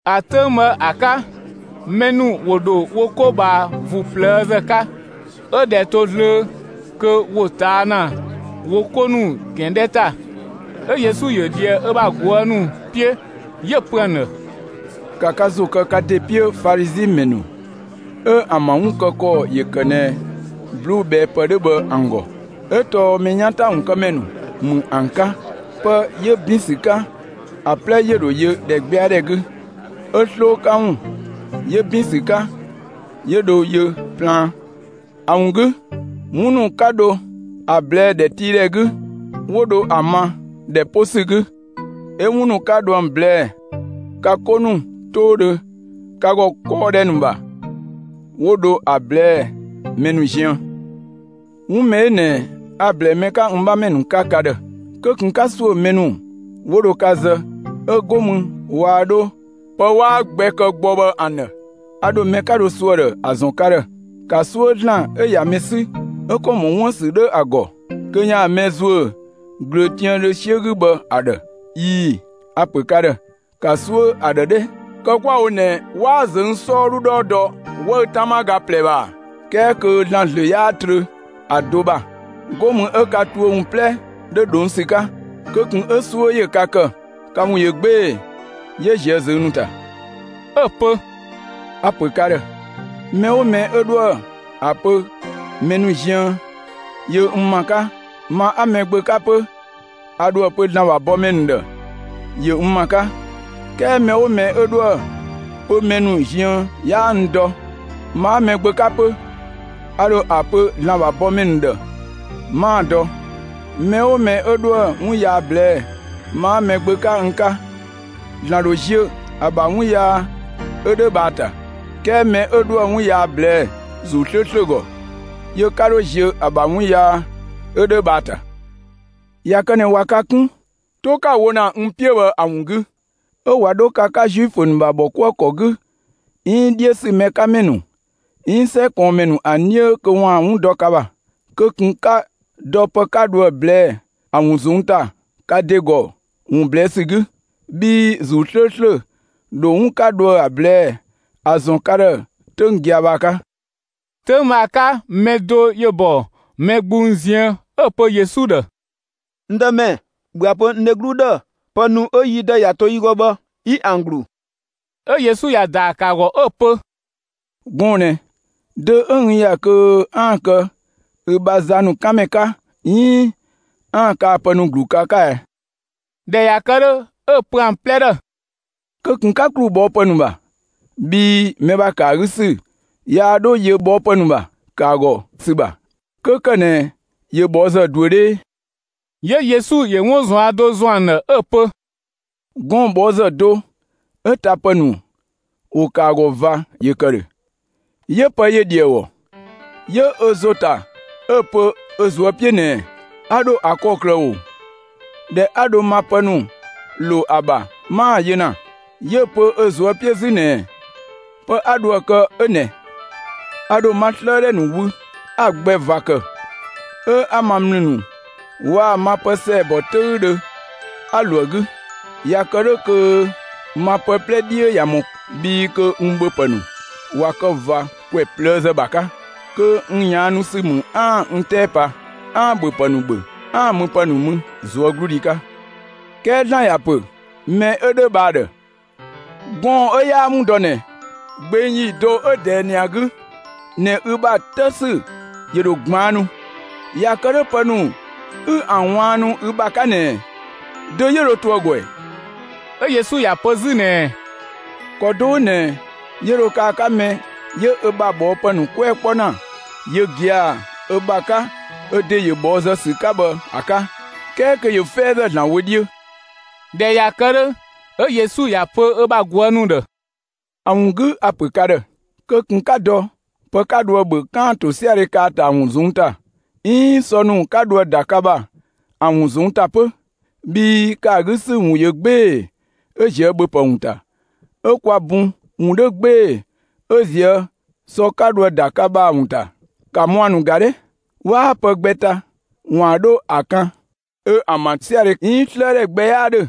‑A 'töng bhë ‑a 'ka, mɛ ‑nu ‑wo ‑dho wo 'ko ꞊bhaa ‑vuu ꞊plëëzë 'ka. 'Ö ꞊dhɛ to zlöö kö ‑wo ꞊taa' ‑na wo 'ko ‑nu ‑gɛn 'dhɛ ‑ta, 'ö Yesu ‑yö ꞊dhië ö bha ꞊guë' ‑nu 'piö, 'yö‑ pö ‑an ‑dhë: «‑Ka ka ‑zo kë ka ‑de 'piö Falizi ‑mɛ ‑nu 'ö ‑an ‑bha 'wun kë ‑kɔ ‑yö ‑kë ꞊nɛ ꞊bluubhɛɛpë 'dhö bhë ‑an ‑gɔ, 'ö tɔɔ mɛ 'yan ‑ta ‑wun kë ‑mɛ ‑nu ‑mü ‑an 'ka! Pë 'yö ‑bin ‑sü 'ka ‑a 'plɛ ‑yö ‑dho yö ‑dhɛgbɛadhɛ 'gü; 'ö 'sloo 'ka ‑wun 'yö ‑bin ‑sü 'ka 'yö dho yö plaan. ‑A ‑wun 'gü, 'wun ‑nu 'ka dho ‑a ꞊blɛɛ'‑ ‑dhɛtiidhɛ 'gü, 'wo dho ‑a ma ‑dhɛ 'po ‑sü 'gü; 'ö 'wun ‑nu 'ka dho ‑an ꞊blɛɛ'‑ ka 'ko 'toodhö ka ‑gɔ kɔɔdhɛ ‑nu ‑bha, 'wo dho ‑a ꞊blɛɛ'‑ mɛ ‑nu ziën.» «'Wun mɛ 'ö ꞊nɛ a‑ ‑blɛɛ mɛ 'ka n 'bhamɛ ‑nu 'ka ka ‑dhë: Kö ꞊kun 'ka ‑suö mɛ ‑nu 'wo dho ka zë, 'ö 'go mü waa 'dho pë 'waa gbɛ kë gbɔ bhë ‑an ‑dhë. A ‑dho mɛ 'ka dho suö ‑a ‑dhë ‑a ‑zɔn ka ‑dhë: ‑Ka 'suö ‑Zlan 'ö ꞊ya mɛ 'sü 'ö ‑kɔ ‑mɔ 'wun ‑bha ‑sü 'dhoë‑ ‑gɔ kö ‑yaan mɛ ‑zuö ꞊glöötiaandhö 'siö 'gü bhë ‑a ‑dhë. ꞊Ii‑, a‑ ‑pö ka ‑dhë: ‑Ka 'suö ‑a ‑dhë 'dhɛ! Kë 'kwa‑ wo ꞊nɛ 'waa ꞊zöng' 'sɔɔdhu 'dhɔɔ dɔ 'wëü‑ 'tama ga ꞊plɛ ‑bha ‑a? 'Kɛɛ kö ‑Zlan ‑zlö 'yaa trö ‑a do ‑de ‑bha. 'Go mü 'ö ka tuö ‑wun 'plɛ 'dho ꞊dhong' ‑sü 'ka. Kö ꞊kun 'ö 'suö ‑yö ka ‑kë, ka ‑wun ꞊yö 'gbee‑ 'yö ꞊zië' ꞊zöng' ‑nu ‑ta!» 'Ö‑ pö: «A‑ ‑pö ka ‑dhë: Mɛ 'oo mɛ 'yö 'dhoë‑ ‑a pö mɛ ‑nu ziën ‑yö n ‑ma 'ka, ma 'a Mɛgbö 'ka 'pö a ‑dho ‑a pö ‑Zlan ‑bha bɔmɛ ‑nu ‑dhë ‑yö n ‑ma 'ka. 'Kɛɛ mɛ 'oo mɛ 'ö 'dhoë‑ pö mɛ ‑nu ziën 'yaa n dɔ, ma 'a Mɛgbö 'ka 'pö, a ‑dho ‑a pö ‑Zlan ‑bha bɔmɛ ‑nu ‑dhë 'maa‑ dɔ. Mɛ 'oo mɛ 'ö 'dhoë‑ 'wun yaa ꞊blɛɛ'‑ ma 'a Mɛgbö 'ka n 'ka, ‑Zlan ‑dho ziö ‑a ‑bha 'wun yaa 'ö 'dhö bhë ‑a ‑ta; 'kɛɛ mɛ 'ö 'dhoë‑ 'wun yaa ꞊blɛɛ'‑ ‑Zuu 'slööslö ‑gɔ, yö 'ka 'dho ziö ‑a ‑bha 'wun yaa 'ö 'dhö bhë ‑a ‑ta. ꞊Ya kë ꞊nɛ ꞊wa ka 'kun, 'to 'ka‑ wo ‑na n 'piö bhë ‑a ‑wun 'gü, 'ö ꞊wa 'dho ka 'ka Zuifö ‑nu ‑bha ‑bhɔkuëkɔ 'gü, 'iin 'dhiö ‑sü ‑mɛ 'ka ‑mɛ ‑nu, 'iin 'sɛ ꞊kɔɔnmɛ ‑nu ‑an 'dhiö kö ‑waan 'wun dɔ ka ‑bha, kö ꞊kun 'ka dɔ pë 'ka dho ‑a ꞊blɛɛ'‑ ‑a ‑wun ꞊zɔnng' ‑ta ka ‑de ‑gɔ ‑wun ꞊blɛɛ' ‑sü 'gü; bhii ‑Zuu 'slööslö ‑dho 'wun 'ka dho ‑a ꞊blɛɛ'‑ ‑a ‑zɔn ka ‑dhë 'töng gia‑ bhë ‑a 'ka.» 'Töng bhë ‑a 'ka, mɛ do ‑yö ‑bɔ mɛ gbung ziën 'ö‑ pö Yesu ‑dhë: «N Dëmɛ, ‑bhö ‑a pö n dheglu ‑dhë, pë ‑nu 'ö yi dë ‑ya to yi ‑gɔ bhë 'yi ‑an ‑glu!» 'Ö Yesu ‑ya ‑daa ‑kë ‑a ‑gɔ 'ö‑ pö: «Gɔɔn‑ ꞊nɛ, dö 'ö n ‑ya kö 'aan‑ kë ü bha za ‑nu 'kan ‑mɛ 'ka, 'iin 'aan‑ kaa‑ pë ‑nu ‑glu ka 'ka ɛ?» ꞊Dhɛ ꞊ya kë 'dhö, 'ö‑ pö ‑an 'plɛ ‑dhë: «Kö ꞊kun 'ka ‑klu ꞊bhɔɔpë ‑nu ‑bha, bhii mɛ ‑bha ‑kë ‑a 'gü ‑sü yaa 'dho yö ꞊bhɔɔpë ‑nu ‑bha ‑kë ‑a ‑gɔ ‑sü ‑bha, 'kö ‑kë ꞊nɛ ‑yö ꞊bhɔɔzë ꞊duö 'dhee.» 'Yö Yesu ‑yö 'wun ꞊zuan' do ‑zɔn ‑an ‑dhë 'ö‑ pö: «Gɔɔn‑ ꞊bhɔɔzë do 'ö tapë ‑nu ‑wo ‑kë ‑a ‑gɔ ꞊va ‑yö ‑kë ‑dhö; 'yö pë ‑yö ‑dhi ‑a ‑gɔ. 'Yö ö ‑zo ‑ta 'ö‑ pö ö ꞊zuö' 'piö ꞊nɛɛ: ‹A ‑dho ‑a kë ‑kɔklë ꞊oo? ꞊Dhɛ 'a dho ma pë ‑nu ‑lo ‑a ‑bha, 'maa‑ yö ‑na!› 'Yö‑ pö ö ꞊zuö' 'piö 'zü ꞊nɛɛ: ‹Pë 'a dho ‑a kë 'ö ꞊nɛ: A ‑dho ma 'slëëdhɛ ‑nu wü 'a‑ gbɛ ꞊va kë, 'ö 'a ma ‑mlü ‑nu waa‑ ma pë ‑sɛɛbɔ 'töüdhö 'a ‑lo ‑a 'gü. ꞊Ya kë 'dhö kö ma pë 'plɛ 'dhiö ꞊ya ‑mɔ, bhii kö n ‑bhöpë ‑nu ꞊wa kë ꞊va ‑kwɛ ꞊plëëzë ‑bha 'ka, kö n ꞊yaannu ‑sü ‑mü 'aan‑ n 'tɛɛ pa, 'aan‑ ‑bhöpë ‑nu ‑bhö 'aan‑ müpë ‑nu mü ꞊zuögludhi 'ka.› 'Kɛɛ ‑Zlan ‑ya ‑pö mɛ 'ö 'dhö bhë ‑a ‑dhë: ‹Gɔɔn‑ 'ö 'yaa‑ 'wun dɔ ꞊nɛ, gbeng ‑yi do 'ö ꞊dɛɛ ꞊nɛ ‑a 'gü ꞊nɛ ü bha 'të ‑sü ‑yö ‑dho ꞊gbaannu, ꞊ya kë 'dhö pë ‑nu 'ü ‑an ꞊waannu ü ‑bha 'ka ꞊nɛ, dö 'yö dho to ‑a ‑gɔ ‑ɛ?›» 'Ö Yesu ‑ya pö 'zü ꞊nɛɛ: «‑Kɔ do 'ö ꞊nɛ 'yö dho kë ‑a 'ka mɛ 'yö ö ‑bha ꞊bhɔɔpë ‑nu 'kpuɛ‑ 'kpɔ ‑na yö gia‑ ö ‑bha 'ka ö ‑de ‑yö ꞊bhɔɔzë ‑sü 'ka bhë ‑a 'ka, 'kɛɛ kö ‑yö 'fɛɛzë ‑Zlan wö 'dhiö.» ꞊Dhɛ ꞊ya kë 'dhö, 'ö Yesu ‑ya pö ö bha ꞊guë' ‑nu ‑dhë: «‑A ‑wun 'gü a‑ ‑pö ka ‑dhë: Kö ꞊kun 'ka dɔ ‑bhöpë 'ka dhoë ‑bhö 'kaan‑ ‑tosiadhe kë ‑a ‑ta ‑a ‑wun ꞊zɔnng' ‑ta, 'iin sɔ ‑nu 'ka dhoë ‑da ka ‑bha ‑an ‑wun ꞊zɔnng' ‑ta 'pö, bhii ‑kë ‑a 'gü ‑sü ‑wun ꞊yö 'gbee‑ 'ö ꞊zië' ‑bhöpë ‑wun ‑ta, 'ö kwa bun ‑wun 'dho 'gbee‑ 'ö ꞊zië' sɔ 'ka dho ‑a ‑da ka ‑bha ‑a ‑wun ‑ta. ‑Ka mua‑ ‑nu ‑ga! 'Waa pë gbɛ ta ‑waan 'dho ‑a 'kan, 'ö ‑an ‑bha 'siödhɛ 'iin 'slëëdhɛ gbɛ 'yaa ‑dhö,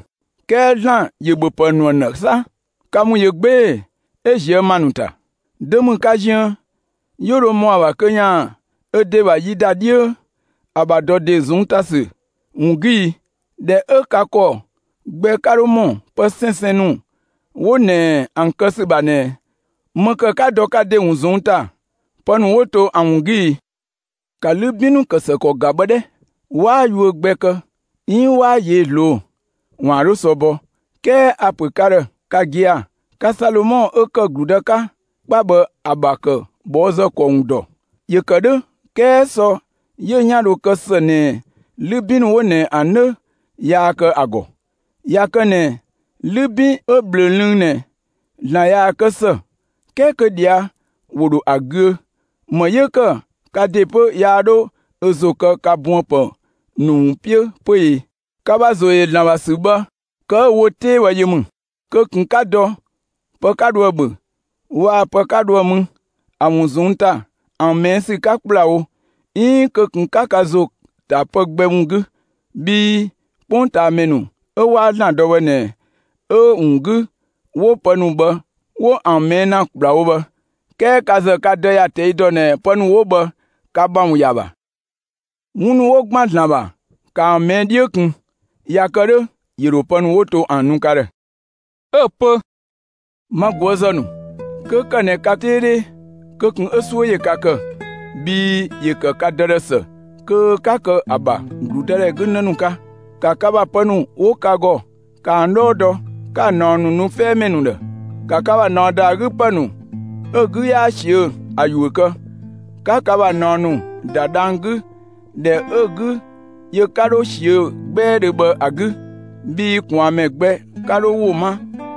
'kɛɛ ‑Zlan ‑yö ‑bhöpë ‑nu ‑an ‑dhë 'sa. Ka ‑wun ꞊yö 'gbee‑ 'ö ꞊zië' ‑ma ‑nu ‑ta! Dö ‑mü ka ziën 'yö dho ‑mɔ ‑a ‑bha kö ‑yaan ö ‑de ‑bha yi ‑da 'dhiö ‑a ‑bha ‑dɔ ‑de ‑wun ꞊zɔnng' ‑ta ‑sü ‑wun 'gü i? ꞊Dhɛ 'ö ka ‑kɔ gbɛ 'ka 'dho ‑mɔ pë 'sɛnsɛn ‑nu 'wo ꞊nɛ ‑an kë ‑sü ‑bha ꞊nɛ, ‑më ‑kë 'ka dɔ ka ‑de ‑wun ꞊zɔnng' ‑ta pë ‑nu 'wo to ‑a ‑wun 'gü i? ‑Ka 'lübin ‑kë ‑së ‑kɔ ‑nu ‑ga bhë 'dhɛ! 'Waa yuö gbɛ kë 'iin 'waa ꞊yee'‑ ꞊zloo'‑ ‑waan 'dho sɔ bɔ, 'kɛɛ a‑ ‑pö ka ‑dhë ka gia‑, ka Salomɔ 'ö ‑kë ‑gludë 'ka 'kpa bhë ‑a ‑bha ‑kë ꞊bhɔɔzë ‑kɔ ‑wun ‑dɔ. ‑Yö ‑kë 'dhö 'kɛɛ sɔ 'yö 'yan dho kë ‑së ꞊nɛ 'lübin ‑nu 'wo ꞊nɛ ‑an do 'dhö yaa kë ‑a ‑gɔ. ꞊Ya kë ꞊nɛ 'lübin 'ö bhlö‑ lënng ꞊nɛ, ‑Zlan ꞊yaa‑ ‑kë ‑së, 'kɛɛ kö ꞊dhia' ‑wo ‑dho ‑a ‑güö, ‑më 'yö‑ ‑kë ka ‑de 'pö yaa 'dho ö ‑zo kë ka buënpë ‑nu ‑wun 'piö 'pö e? Ka ‑bha ‑zo ‑yö ‑Zlan ‑bha ‑sü bhë, kë 'ö‑ wo 'tee bhë yö ‑mü! Kö ꞊kun 'ka dɔ pë 'ka dho ‑a ‑bhö waa‑ pë 'ka dho ‑a mü ‑a ‑wun ꞊zɔnng' ‑ta ‑an ꞊mɛɛ' ‑sü 'ka ‑kplawo, 'iin kö ꞊kun 'ka ka ‑zo ‑ta pë gbɛ ‑wun 'gü, bhii 'kpongtaamɛ ‑nu 'ö 'waa ‑Zlan dɔ bhë ꞊nɛ 'ö‑ ‑wun 'gü 'wo pë ‑nu bhë 'wo ‑an ꞊mɛɛ' ‑na ‑kplawo bhë. 'Kɛɛ ka ‑zë ka Dë ‑ya ꞊tɛi' ‑dɔ ꞊nɛ pë ‑nu 'wo bhë ka ‑bha ‑wun ‑ya ‑bha. 'Wun ‑nu 'wo ‑gban ‑Zlan ‑bha, ‑kaa ‑an ꞊mɛɛ' 'dhiö ꞊kun; ꞊ya kë 'dhö, ‑yö ‑dho pë ‑nu 'wo to ‑an nu ka ‑dhë.» 'Ö‑ pö: «Ma ꞊guëzë ‑nu, 'kö ‑kë ꞊nɛ ka 'tee 'dhee, kö ꞊kun 'ö 'suö ‑yö ka ‑kë, bhii ‑yö ‑kë ka Dë ‑dhë ‑së kö 'ka kë ‑a ‑bha ‑gludëdhɛ 'gü ‑në ‑nu 'ka! Ka ‑bha pë ‑nu 'wo ka ‑gɔ, ‑ka ‑an 'dhɔɔ dɔ, 'ka‑ ꞊naɔ ‑nu nu 'fɛɛmɛ ‑nu ‑dhë. ‑Ka ka ‑bha ꞊naɔ ‑da ‑a 'gü ‑pë ‑nu 'ö‑ 'gü 'yaa ꞊siö'‑ ‑a ‑yuö kë, 'ka ka ‑bha ꞊naɔ ‑nu ‑da dhang‑ 'gü ‑dhɛ 'ö‑ 'gü ‑yö 'ka 'dho ꞊siö'‑ 'gbɛɛdhö bhë ‑a 'gü, bhii ꞊kwaanmɛ gbɛ 'ka 'dho ‑wo 'ma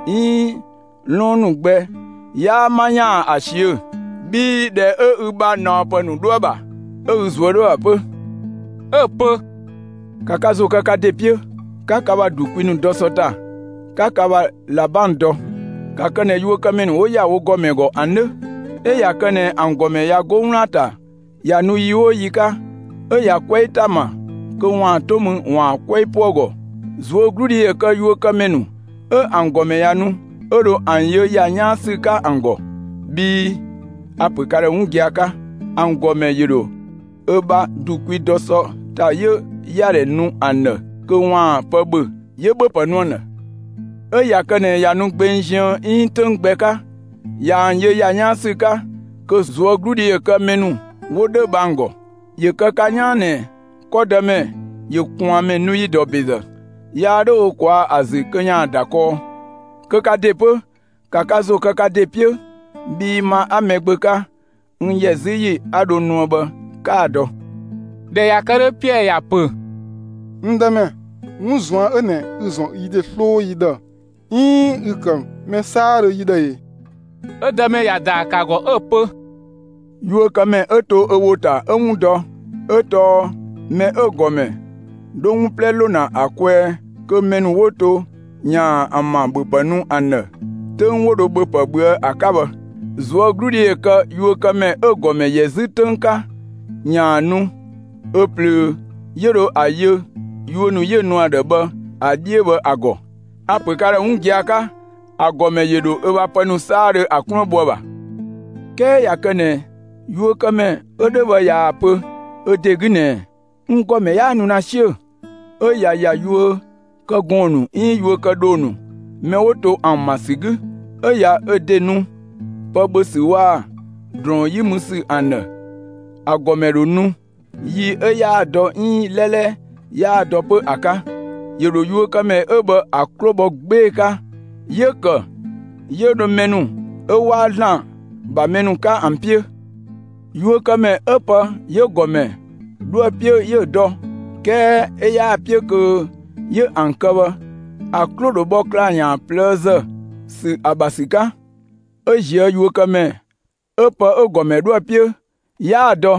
'iin 'lɔɔn ‑nu gbɛ 'yaa 'ma ‑yaan ‑a ꞊siö'‑. Bhii ‑dhɛ 'ö ü bha ꞊naɔpë ‑nu 'dho ‑a ‑bha, 'ö ü ꞊zuö' 'dhoë‑ ‑bha 'pö.» 'Ö‑ pö: «‑Ka ‑zo kë ka ‑de 'piö, 'ka ka ‑bha ‑du kwi dɔ sɔ ‑ta, 'ka ka ‑bha ꞊labang dɔ! ‑Ka kë ꞊nɛ yuökëmɛ ‑nu 'wo ‑ya wo ‑gɔmɛ ‑gɔ ‑an 'dhö! 'Ö ꞊ya kë ꞊nɛ ‑an ‑gɔmɛ ꞊ya 'go 'wlaan‑ ‑ta ꞊ya nu yi 'oo yi 'ka, 'ö ꞊ya 'kwɛɛ ‑ta ‑ma kö ‑waan 'to mü ‑waan 'kwɛɛ 'po ‑a ‑gɔ. ꞊Zuögludhi ‑yö kë yuökëmɛ ‑nu 'ö ‑an ‑gɔmɛ ꞊ya nu, 'ö dho ‑an yö ‑ya 'yaan ‑sü 'ka ‑an ‑gɔ! Bhii a‑ ‑pö ka ‑dhë 'wun gia‑ 'ka ‑an ‑gɔmɛ ‑yö ‑dho ö bha ‑du kwi dɔ sɔ ‑ta 'yö ‑yadhɛ nu ‑an ‑dhë kö ‑waan pë ‑bhö, 'yö ‑bhöpë nu ‑an ‑dhë. 'Ö ꞊ya kë ꞊nɛ ꞊ya nu gbeng ziën 'iin 'töng gbɛ 'ka, ꞊ya ‑an yö ‑ya 'yaan ‑sü 'ka, kö ꞊zuögludhi ‑yö kë mɛ ‑nu 'wo 'dhö bhë ‑an ‑gɔ! ‑Yö kë ka 'yaan ꞊nɛ 'kɔdëmɛ ‑yö ꞊kwaanmɛ nu ‑yi ‑dɔ ‑bezë, yaa 'dho ö ꞊kwaa' ‑a ‑zü kö ‑yaan ‑da kɔɔ. Kö ka ‑de 'pö, ‑ka ka ‑zo kë ka ‑de 'piö, bhii ma 'a Mɛgbö 'ka, n ‑yɛ 'zü ‑yi 'a dho nuë bhë 'kaa‑ dɔ!» ꞊Dhɛ ꞊ya kë 'dhö, Piɛɛ ‑ya ‑pö: «N Dëmɛ, 'wun ꞊zuan' 'ö ꞊nɛ ü‑ ‑zɔn yi ‑de 'sloo yi ‑dhë, 'iin ü‑ ‑kë mɛ 'saadhö yi ‑dhë e?» 'Ö Dëmɛ ‑ya ‑daa ‑kë ‑a ‑gɔ 'ö‑ pö: «Yuökëmɛ 'ö to ö ‑wo ‑ta 'yö 'wun dɔ, 'ö tɔɔ mɛ 'ö‑ ‑gɔmɛ 'dho 'wun 'plɛ ‑lo ‑na ‑a kwɛɛ kö mɛ ‑nu 'wo to ‑yaan ‑an ‑bha ‑bhöpë nu ‑an ‑dhë 'töng 'wo dho ‑bhöpë ꞊bhöë' ‑a 'ka bhë. ꞊Zuögludhi ‑yö kë yuökëmɛ 'ö‑ ‑gɔmɛ ‑yɛ 'zü 'töng 'ka ‑yaan nu ö ꞊plöö 'yö dho ‑a yö yuö ‑nu 'yö‑ nu ‑a ‑dhë bhë ‑a 'dhiö bhë ‑a ‑gɔ. A‑ ‑pö ka ‑dhë 'wun gia‑ 'ka: ‑A ‑gɔmɛ ‑yö ‑dho ö bha pë ‑nu 'saadhö ‑a 'kluën bho ‑a ‑bha. 'Kɛɛ ꞊ya kë ꞊nɛ yuökëmɛ 'ö 'dhö bhë ꞊yaa‑ pö ö ‑de 'gü ꞊nɛɛ: ‹N ‑gɔmɛ 'yaa nu ‑na 'siö‑›, 'ö ꞊ya ‑ya yuökëgɔɔn ‑nu 'iin yuökëdhoo ‑nu mɛ 'wo to ‑an ‑ma ‑sü 'gü, 'ö ‑ya ö ‑de nu pë ‑bhö ‑sü waa‑ ‑drɔɔn 'yi mü ‑sü ‑an ‑dhë, ‑a ‑gɔmɛ ‑dho nu yi 'ö 'yaa‑ dɔ 'iin 'lɛlɛ 'yaa‑ dɔ 'pö ‑a 'ka. ‑Yö ‑dho yuökëmɛ 'ö bhë ‑a 'klo bhɔ 'gbee‑ 'ka, 'yö‑ ‑kë 'yö dho mɛ ‑nu 'ö 'waa ‑Zlan ‑bha mɛ 'ka ‑an 'piö. Yuökëmɛ 'ö pë 'yö‑ ‑gɔmɛ 'dho ‑a 'piö 'yö‑ dɔ, 'kɛɛ 'ö 'yaa‑ 'piö kö 'yö ‑an kë bhë, ‑a 'klo ‑dho bhɔ ‑klaa ‑yan ꞊plëëzë ‑sü ‑a ‑bha ‑sü 'ka, 'Ö ꞊zië' yuökëmɛ 'ö pë 'ö‑ ‑gɔmɛ 'dhoë‑ 'piö 'yaa‑ dɔ,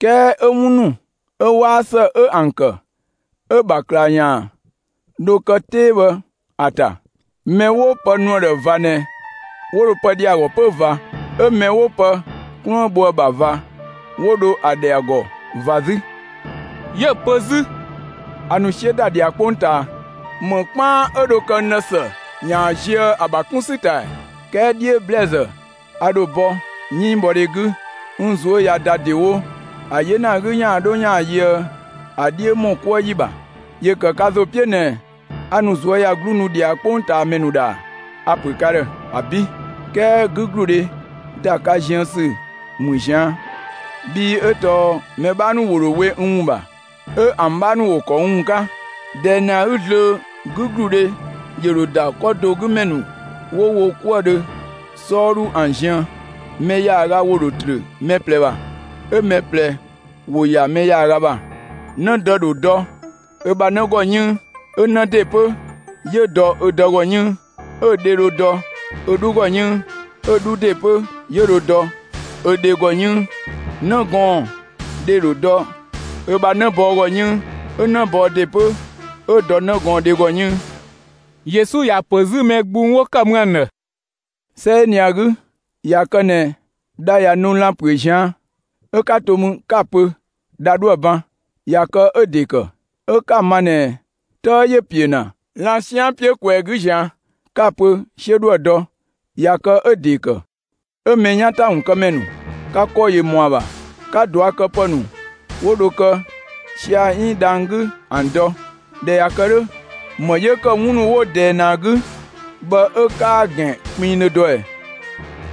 'kɛɛ 'ö 'wun ‑nu 'ö 'waa ‑së 'ö ‑an ‑kë, 'ö‑ ‑bha ‑klaa ‑yan ‑dho kë 'tee bhë ‑a ‑ta. Mɛ 'ö 'wo pë nu ‑a ‑dhë ꞊va ꞊nɛ, 'wo dho pë ‑dhɛ ‑a ‑gɔ 'pö ꞊va. 'Ö mɛ 'wo pë 'kluën bho ‑a ‑bha ꞊va, 'wo dho ‑a ‑dhɛ ‑a ‑gɔ ꞊va 'zü!» 'Yö‑ pö 'zü: «A ‑nu 'siö ‑da ꞊dhia 'kpongtaa. ‑Më 'kpaan 'ö dho kë n ‑dhë ‑së ‑yaan zië ‑a ‑bha 'kun ‑sü ‑ta ‑ɛ! 'Kɛɛ 'dhiö ‑blɛɛzë a ‑dho bɔ 'yënngbhɔdhe 'gü; n ꞊zuö' ꞊ya ‑da ‑dewo ‑a 'yena 'gü ‑yaan 'dho ‑yaan yöë ‑a 'dhiö ‑mɔ 'kuë ‑yi ‑bha! ‑Yö ‑kë ka ‑zo 'piö ꞊nɛ a ‑nu ꞊zuöyagluu nu ꞊dhia 'kpongtaamɛ ‑nu ‑dhë ‑a? A‑ ‑pö ka ‑dhë: ‑Abi', 'kɛɛ 'gügludhe ‑da ka ziën ‑sü ‑mü ꞊zian', bhii 'ö tɔɔ mɛ 'bhaa ‑nu ‑wo ‑dho we n ‑wun ‑bha, 'ö ‑an 'bhaa ‑nu ‑wo ‑kɔ n ‑wun 'ka. ꞊Dɛɛ ꞊nɛ ‑a 'gü zlöö, 'gügludhe ‑yö ‑dho ‑da 'kɔ do 'gü ‑mɛ ‑nu 'wo wo 'kuëdhö 'sɔɔdhu ‑an ziën; mɛ ‑yaaga ‑wo ‑dho ‑trö mɛ ꞊plɛ ‑bha, 'ö mɛ ꞊plɛ ‑wo ‑ya mɛ ‑yaaga ‑bha. 'Nëdë ‑dho dɔ ö bha 'në ‑gɔ 'yënng, 'ö 'në ‑de 'pö 'yö dɔ ö dë ‑gɔ 'yënng; 'ö dhe dho dɔ ö 'dhu ‑gɔ 'yënng, 'ö‑ 'dhu ‑de 'pö 'yö dho dɔ ö dhe ‑gɔ 'yënng. 'Në gɔɔn‑ dhe ‑dho dɔ ö bha 'në bɔɔ ‑gɔ 'yënng, 'ö 'në bɔɔ ‑de 'pö 'yö dɔ 'në gɔɔn‑ dhe ‑gɔ 'yënng.» Yesu ‑ya ‑pö 'zü mɛ gbung 'wo ‑kë mü ‑an ‑dhë: «'Sɛ 'ö ꞊nɛ ‑a 'gü, ꞊ya kë ꞊nɛ dha ꞊ya nu lan‑ ‑püö ꞊zian', 'ö 'ka to mü 'ka‑ pö dha 'dhoë‑ ban; ꞊ya kë 'ö‑ ‑de ‑kë. 'Ö 'ka‑ ma ꞊nɛ 'tëë ‑yö ‑piö ‑na lan‑ 'sian 'piö ꞊kwɛɛ‑ 'gü ꞊zian', 'ka‑ pö 'siö 'dhoë‑ dɔ, ꞊ya kë 'ö‑ ‑de ‑kë. 'Ö, mɛ 'yan ‑ta ‑wun kë ‑mɛ ‑nu! Ka ‑kɔ ‑yö ‑mɔ ‑a ‑bha 'ka ꞊duakëpë ‑nu 'wo dho kë sia‑ 'iin dhang‑ 'gü ‑an dɔ; ꞊dhɛ ꞊ya kë 'dhö, ‑më 'yö‑ ‑kë 'wun ‑nu 'wo ꞊dɛɛ ꞊nɛ ‑a 'gü bhë 'ö 'kaa‑ ‑gɛn kpinngdhö dɔ ꞊ɛ?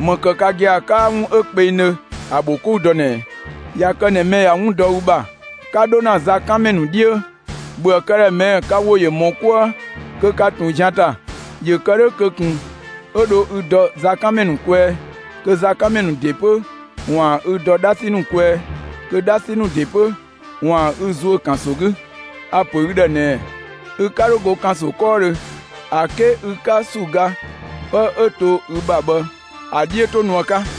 ‑Më ‑kë ka gia‑ 'kaa 'wun 'ö kpengdhö ‑a ‑bho 'kou dɔ ꞊nɛɛ? ꞊Ya kë ꞊nɛ mɛ ꞊ya 'wun dɔ ü ‑bha, 'ka 'dho ‑na zakanmɛ ‑nu 'dhiö, ‑bhöë këdhɛ ꞊mɛɛ' ka ‑wo ‑yö ‑mɔ 'kuë kö ka ꞊tun zian ‑ta; ‑yö ‑kë 'dhö kö ꞊kun 'ö dho ü dɔ zakanmɛ ‑nu kwɛɛ, kö zakanmɛ ‑nu ‑de 'pö ‑waan ü dɔ 'dhasi ‑nu kwɛɛ, kö 'dhasi ‑nu ‑de 'pö ‑waan ü ‑zuö ‑kanso 'gü. A‑ ‑pö ü ‑dhë ꞊nɛɛ: Ü'ka 'dho go ‑kanso 'kɔɔdhö ‑a 'ke ü 'ka ‑su ga 'pë 'ö to ü ‑bha bhë ‑a 'dhiö 'to nu ‑a 'ka!»